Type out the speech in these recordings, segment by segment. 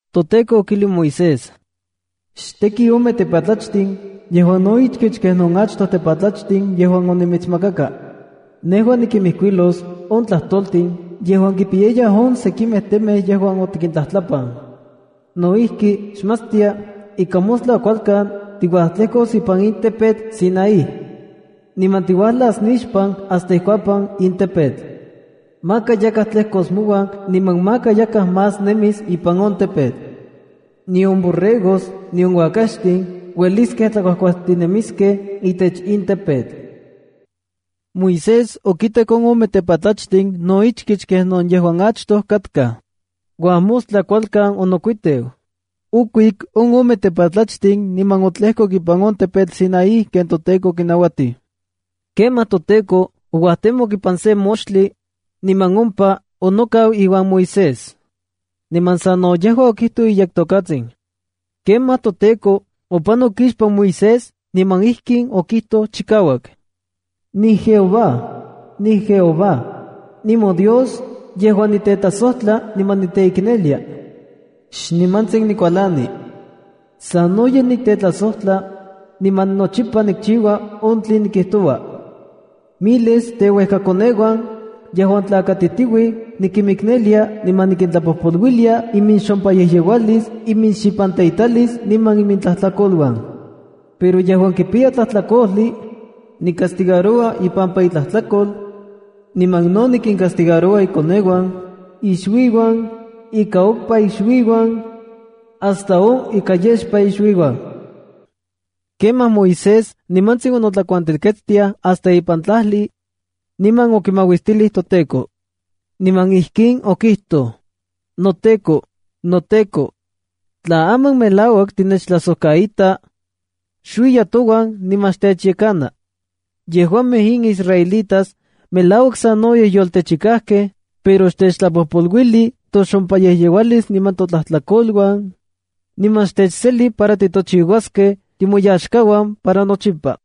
ToTEKO okijlij Moisés: —Xteki ome tepatlachtin yejuan no ichkich kenon achtoj tepatlachtin yejuan onimitsmakaka. Nejua nikijkuilos on tlajtoltin yejuan kipiyaya on sekimej temej yejuan otikintlajtlapan. No ijki, xmatstia ika mostla kualkan tiuajtlejkos ipan in tepetl Sinaí. Niman tiuajlas nixpan hasta ikuapan in tepetl. Maka yakaj tlejkos mouan niman maka yakaj más nemis ipan on tepetl. Nion borregos nion uakaxtin xueliskej tlakuajkuajtinemiskej itech in tepetl. Moisés okitek on ome tepatlachtin no ichkich kenon yejuan achtoj katkaj. Uajmostla kualkan onokuiteu, okuik on ome tepatlachtin niman otlejkok ipan on tepetl Sinaí ken toTEKO okinauatij. Kemaj toTEKO ouajtemok ipan sen moxtli, niman ompa onokau iuan Moisés. Niman sa no yejua okijtoj iyektokatsin. Kemaj toTEKO opanok ixpan Moisés niman ijkin okijtoj chikauak: —¡NiJehová! ¡NiJehová! ¡NimoDios yejuan nitetlasojtla niman niteiknelia! Xnimantsin nikualani. Sanoyej nitetlasojtla, niman nochipa nikchiua on tlen nikijtoua. Miles teuejkakoneuan yejuan tlakatitiuij nikimiknelia, niman nikintlapojpoluilia iminxompayejyeualis, iminxipanteitalis niman imintlajtlakoluan. Pero yejuan kipiya tlajtlakojli, nicastigaroua ipampa itlajtlakol, niman no nikincastigaroua ikoneuan, ixuiuan, ika okpa ixuiuan, hasta on ika yexpa ixuiuan. Kemaj Moisés nimantsin onotlakuantelketstiaj hasta ipan tlajli, niman okimauistilij toTEKO. Niman ijkin okijtoj: —¡NoTEKO, noTEKO! Tla aman melauak tinechtlajsojkaita, xuiya touan niman xtechyekana. Yejuamej in israelitas melauak sanoyej yoltechikajkej, pero xtechtlapojpoluili toxompayejyeualis niman totlajtlakoluan, niman xtechseli para titochiuaskej timoyaxkauan para nochipa.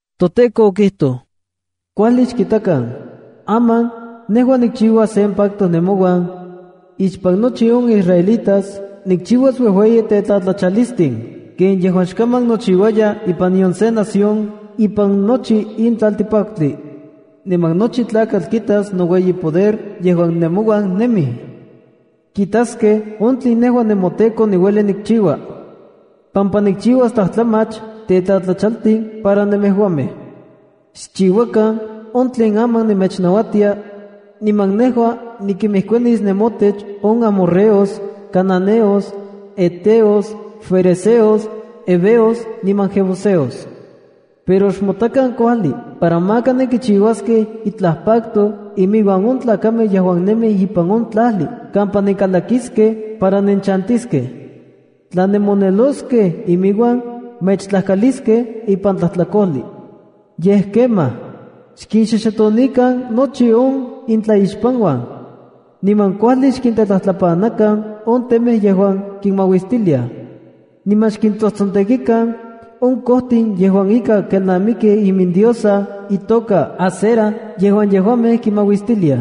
ToTEKO okijtoj: “¡Kuajli xkitakan! Aman nejua nikchiua sen pacto nemouan. Ixpan nochi on israelitas nikchiuas uejueyi tetlatlachalistin ken yejuan xkaman nochiuaya ipan nion se nación ipan nochi in tlaltipaktli. Niman nochi tlakatl kitas noueyipoder yejuan nemouan nemij. Kitaskej on tlen nejua nemoTEKO niueli nikchiua, pampa nikchiuas tlajtlamach tetlatlachaltij para nemejuamej. ’Xchiuakan on tlen aman nemechnauatia, niman nejua nikinmejkuanis nemotech on amorreos, cananeos, heteos, ferezeos, heveos niman jebuseos. ’Pero xmotakan kuajli para maka nenkichiuaskej itlaj pacto inmiuan on tlakamej yejuan nemij ipan on tlajli kampa nenkalakiskej para nenchantiskej. Tla nenmoneloskej iminuan, mechtlajkaliskej ipan tlajtlakojli. Yej kemaj, xkinxoxotonikan nochi on intlaixpanuan, niman kuajli xkintetlajtlapanakan on temej yejuan kinmauistiliaj. Niman xkintsojtsontekikan on kojtin yejuan ika kelnamikij imindiosa itoka Aseraa yejuan yejuamej kinmauistiliaj.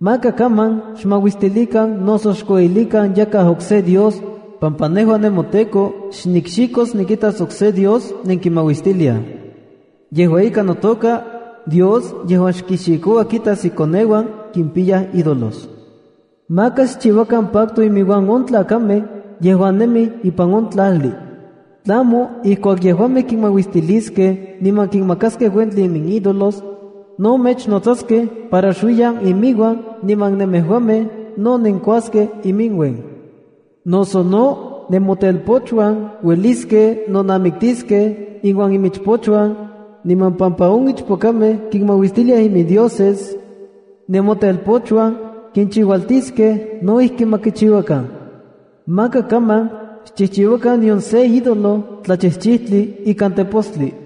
’Maka kaman xmauistilikan noso xkueyilikan yakaj okse dios, pampa nejua nemoTEKO xnikxikos nikitas okse dios nenkimauistiliaj. Yejua ika, notoka: “Dios yejuan xkixikoua kitas ikoneuan kimpiyaj ídolos.” ’Maka xchiuakan pacto iminuan on tlakamej yejuan nemij ipan on tlajli. Tlamo ijkuak yejuamej kinmauistiliskej niman kinmakaskej uentli iminídolos, no mechnotsaskej para xuiyan iminuan niman nemejuamej no nenkuaskej iminuen. Noso no nemotelpochuan ueliskej nonamiktiskej iuan imichpochuan, niman pampa on ichpokamej kinmauistiliaj imindioses, nemotelpochuan kinchiualtiskej no ijki ma kichiuakan. ’Maka kaman xchijchiuakan nion se ídolo tlachijchijtli ikan tepostli.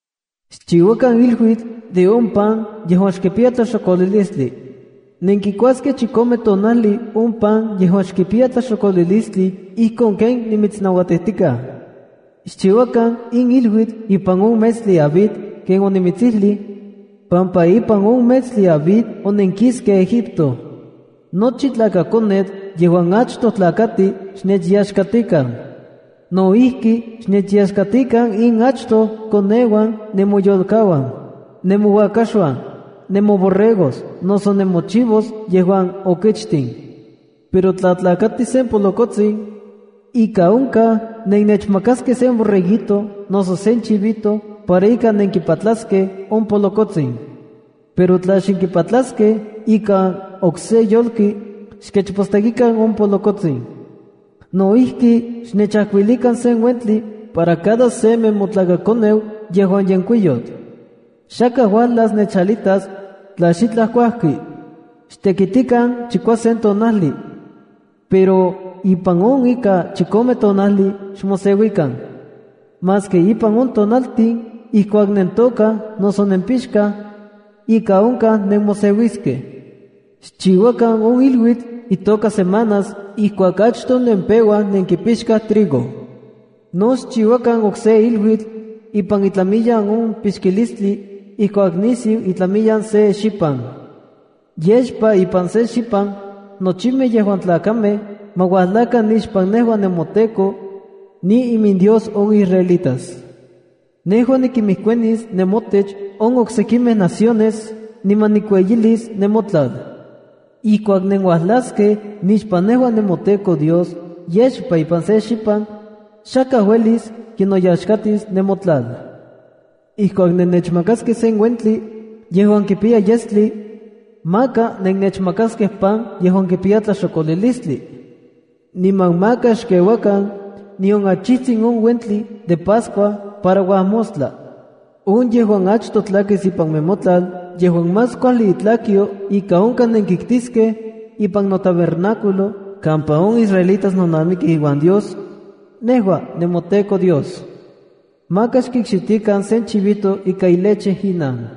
’Xchiuakan iluitl de on pan yejuan xkipiya tlaxokolilistli. Nenkikuaskej chikome tonajli on pan yejuan xkipiya tlaxokolilistli ijkon ken nimitsnauatijtikaj. Xchiuakan in iluitl ipan on metstli Abib ken onimitsijlij, pampa ipan on metstli Abib onenkiskej Egipto. ’Nochi tlakakonetl yejuan achtoj tlakati xnechyaxkatikan. No ijki, xnechyaxkatikan in achtoj koneuan nemoyolkauan, nemouakaxuan, nemoborregos noso nemochivos yejuan okichtin. Pero tla tlakati sen polokotsin, ika onkaj nenechmakaskej sen borreguito noso sen chivito para ika nenkipatlaskej on polokotsin. Pero tla xnenkipatlaskej ikan okse yolki, xkechpostekikan on polokotsin. No ijki, xnechajkuilikan sen uentli para cada se nemotlakakoneu yejuan yenkuiyotl. Xakaj uajlas nechalitas tla xitlaj kuajki. ’Xtekitikan chikuasen tonajli, pero ipan on ika chikome tonajli xmoseuikan. Maski ipan on tonaltin ijkuak nentokaj noso nempixkaj, ika onkaj nemoseuiskej. ’Xchiuakan on iluitl itoka Semanas ijkuak achtoj nempeuaj nenkipixkaj trigo. No xchiuakan okse iluitl ipan itlamiyan on pixkalistli ijkuak nisiu itlamiyan se xipan. ’Yexpa ipan se xipan nochimej yejuan tlakamej ma uajlakan nixpan nejua nemoTEKO, niiminDios on israelitas. Nejua nikinmejkuanis nemotech on oksekimej naciones, niman nikueyilis nemotlal. Ijkuak nenuajlaskej nixpan nejua nemoTEKO Dios yexpa ipan se xipan, xakaj uelis kinoyaxkatis nemotlal. ’Ijkuak nenechmakaskej sen uentli yejuan kipiya yestli, maka nennechmakaskej pan yejuan kipiya tlaxokolilistli. Niman maka xkeuakan nion achijtsin on uentli de Pascua para uajmostla. ’On yejuan achtoj tlakis ipan nemotlal yejuan más kuajli itlakyo ika onkaj nenkiktiskej ipan notabernáculo kampa on israelitas nonamikij iuan Dios, nejua nemoTEKO Dios. Maka xkikxitikan sen chivito ika ileche inan.”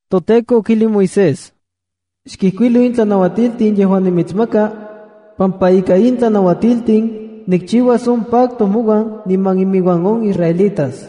ToTEKO okijlij Moisés: “Xkijkuilo in tlanauatiltin yejuan nimitsmaka, pampa ika in tlanauatiltin nikchiuas on pacto mouan niman iminuan on israelitas.”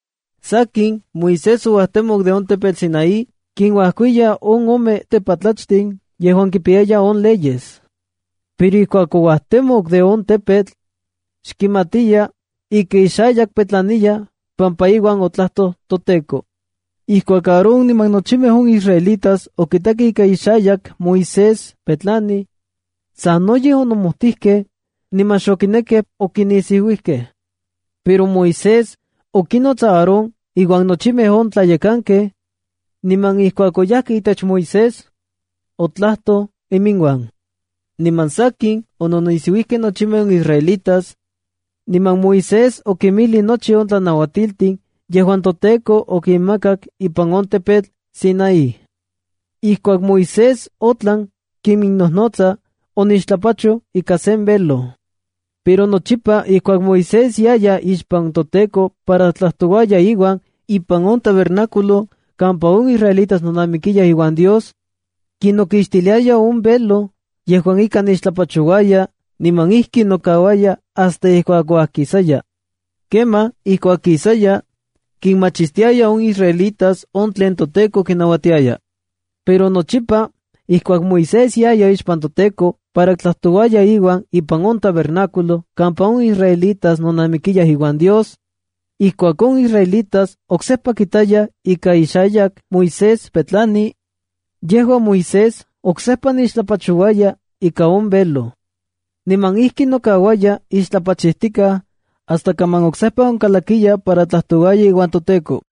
Sakin, Moisés ouajtemok de on tepetl Sinaí kinuajkiya on ome tepatlachtli yejuan kipiya on leyes. Pero ijkuak ouajtemok de on tepetl, xkimatiya ika ixayak petlaniya pampa iuan otlajtoj toTEKO. Ijkuak Aarón niman nochimej on israelitas okitakej ika ixayak Moisés petlani, sanoyej onomojtijkej niman xokinekej okinisiuiskej. Pero Moisés okinnots Aarón iuan nochimej on tlayekankej, niman ijkuak oyajkej itech Moisés, otlajtoj inmiuan. Niman sakin, ononisiuijkej nochimej on israelitas, niman Moisés okinmijlij nochi on tlanauatiltin yejuan toTEKO okimakak ipan on tepetl Sinaí. Ijkuak Moisés otlan kiminnojnotsa, onixtlapachoj ika sen velo. Pero nochipa ijkuak Moisés yaya ixpan toTEKO para tlajtouaya iuan ipan on tabernáculo kampa on israelitas nonamikiyaj iuan Dios, kinokixtiliaya on velo yejuan ika nixtlapachouaya niman ijki nokauaya hasta ijkuak uajkisaya. Kemaj ijkuak kisaya, kinmachistiaya on israelitas on tlen toTEKO kinauatiaya. Pero nochipa ijkuak Moisés yaya ixpan toTeko para tlajtouaya iuan ipan on tabernáculo kampa on israelitas nonamikiyaj iuan Dios, Ijkuak on israelitas oksejpa kitayaj ika ixayak Moisés petlani, yejua Moisés oksejpa nixtlapochouaya ika on velo. Niman ijki nokauaya ixtlapachijtikaj hasta kaman oksejpa onkalakiya para tlajtouaya iuan toTEKO.